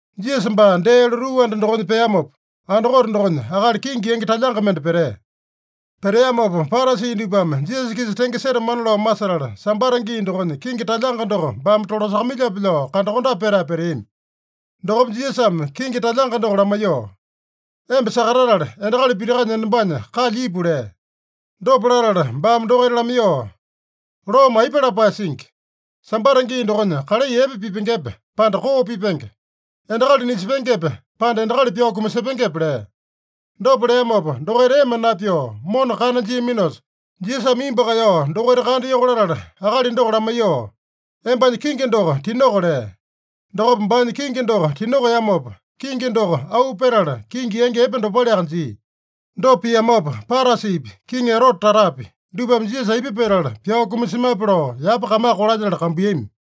Jisasa baa dee lotuu anda dokonya peamopa, andakote dokonya akali kingi yangi talyanga mende petea. Peteamopa, Parasi dupame Jisasa-kisa tenge setamana lao masetala, Sambata gii dokonya kingi talyanga doko baame tolasakamailyape lao kandakondape petae peteami. Dokopa Jisasame kingi talyanga doko lamaiyoo, “Emba sakatatala, endakali pitakanya enombanya kalya ipu” lea. Dopa latala baame dokaita lamaiyoo, “Loome aipa lapae singi? Sambata gii dokonya kalai epe pipengepe, pande koo pipenge? Endakali nisepengepe, pande endakali pyao kumasepengepe?” lea. Dopa leamopa, dokaita ema napyoo mona kana jiaminosa, Jisasame imbu kaeyao dokaita kandayoko latala, akali doko lamaiyoo, “Embanya kingi doko tinoko” lea. Dokopa baanya kingi doko tinokeamopa, kingi doko auu petala kingi yangi epe dopaleaka jia. Dopa piamopa, Parasipi, Kiŋi Erote tatapi, dupame Jisasa aipa petala pyao kumasemape lao yapa kamaka kolalyetala kambuiyami.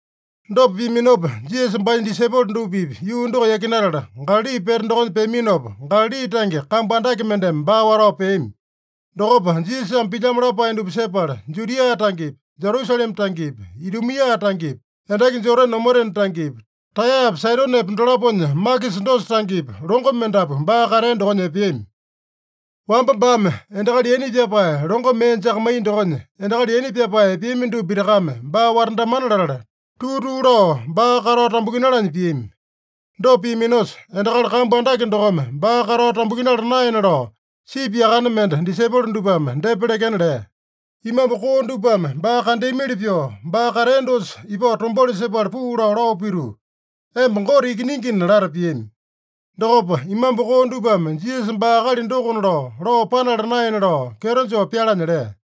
Dopa piaminopa, Jisasa baanya disaipolo dupa-pipa yuu doko yakinatala, Galali pete dokonya peaminopa, Galali tange kambu andake mendeme baa watao peami. Dokopa Jisasame pilyamo lapae dupa sepala, Judia tangepi, Jerusalema tangepi, Idumia tangepi, endaki Jodane omotena tangepi, Taeyapa Saidonepa dolaponya makisa dosa tangepi, longo mendapu baa katea dokonya epeami. Wamba baame endakali yaina pyapae longo mee jakamaiya dokonya, endakali yaina pyapae epeami dupa pitakame baa watandamana latala, tuu-tuu lao baa katao tambukinalanya piami. Dopa piaminosa, endakali kambu andake dokome baa katao tambukinala naena lao, sipi yakane mende disaipolo dupame depa lekena lea. Imambu koo dupame baa kandeamili pyoo, baa katea dosa ipao tombauli sepala puu lao, lao pituu, “Emba Gote Ikiningina” lata piami. Dokopa imambu koo dupame Jisasa baa akali dokona lao, lao panala naena lao kyeto joo pyalanya lea.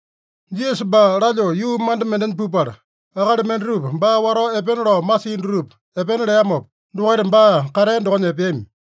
Jisasa baa lalyoo yuu manda mendenya pupala, akali mendatupa baa watao epena lao masia dutupa epena leamopa, dokaita baa katea dokonya epeami.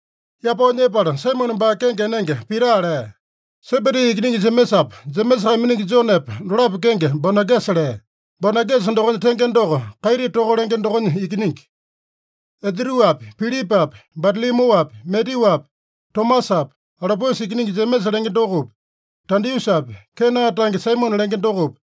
Yapao nyepala, Saimone baa kenge enenge Pita lea. Sebedi ikiningi Jemesapa, Jemesa kaiminingi Jonepa dolapo kenge Bonagesa lea. (Bonagesa dokonya tenge doko, Kaiti toka lenge dokonya ikiningi.) Andruapi, Pilipapi, Batalomyuapi, Matyuapi, Tomasapi, Alopiusa ikiningi Jemesa lenge dokopi, Tadiusapi, Kena tange Saimone lenge dokopi,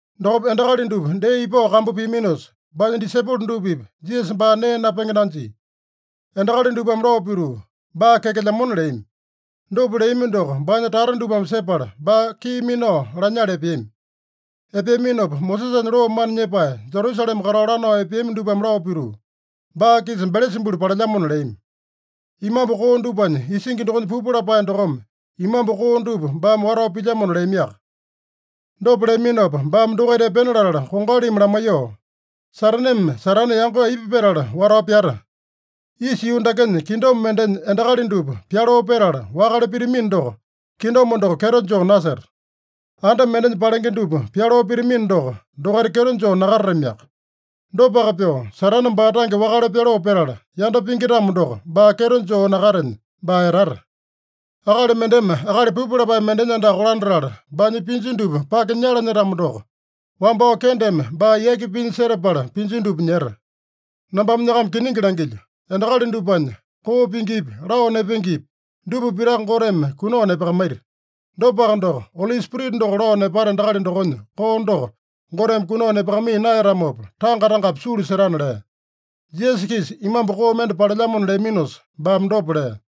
Dokopa endakali dupa dee ipao kambu piaminosa, baanya disaipolo dupa-pipa Jisasa baa nee napenge nanjia. Endakali dupame lao pituu, “Baa kyakelyamona” leami. Dopa leami doko baanya tata dupame sepala, baa kii minao lanyala epeami. Epeaminopa Mosesanya loo mana nyepae, Jerusalema katao lanao epeami dupame lao pituu, “Baa-kisa Belesabulu palelyamona” leami. “Imambu koo dupanya isingi dokonya pupu lapae dokome imambu koo dupa baame watao pilyamona” leamiaka. Dopa leaminopa, baame dokaita epena latala kongalimi lamaiyoo, “Sataneme Satane yango aipa petala watao pyata? Isa yuu dakenya kingdom mendenya endakali dupa pyaloo petala wakale pitamino doko, kingdom doko kyeto joo naseta. Anda mendenya palenge dupa pyaloo pitamino doko, dokaita kyeto joo nakatatamiaka. Dopaka pyoo, Satane baa tange wakale pyaloo petala, yanda pingi-tamo doko, baa kyeto joo nakatenya, baa etata. Akali mendeme akali pupu lapae mendenya andaka kolandatala, baanya pinju dupa pake nyalanya-tamo doko, wambao kendeme baa yaki pinya setapala pinju dupa nyeta. “Nambame nyakama kiningi langilyo: Endakali dupanya koo pingipi, lao nepengepi dupa pitaka Goteme kunao nepakamaita. Dopaka doko, Oli Spirita doko lao nepata endakali dokonya koo doko Goteme kunao nepakamaiya naeyatamopa, tanga tangapi sulu setana” lea. Jisasa-kisa imambu koo mende palelyamona leaminosa, baame dopa lea.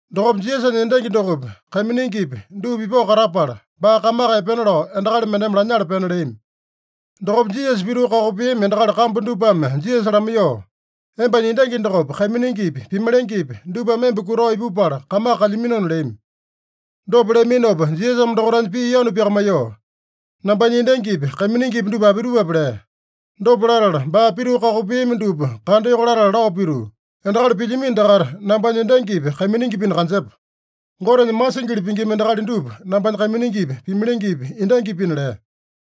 Dokopa Jisasanya endangi dokopi, kaiminingipi dupa ipao katapala, baa kamaka epena lao endakali mendeme lanyala pena leami. Dokopa Jisasa pituu kakopeami endakali kambu dupame Jisasa lamaiyoo, “Embanya endangi dokopi, kaiminingipi, pimalengepi dupame emba kutao ipupala kamaka kalyaminona” leami. Dopa leaminopa Jisasame dokaitanya pii yanu pyakamaiyoo, “Nambanya endangipi, kaiminingipi dupa apitupape?” lea. Dopa latala baa pituu kakopeami dupa kandayoko latala lao pituu, “Endakali pilyamino dakaita nambanya endangipi, kaiminingipina kanjepa. Gotenya masingili pingima endakali dupa nambanya kaiminingipi, pimalengepi, endangipina” lea.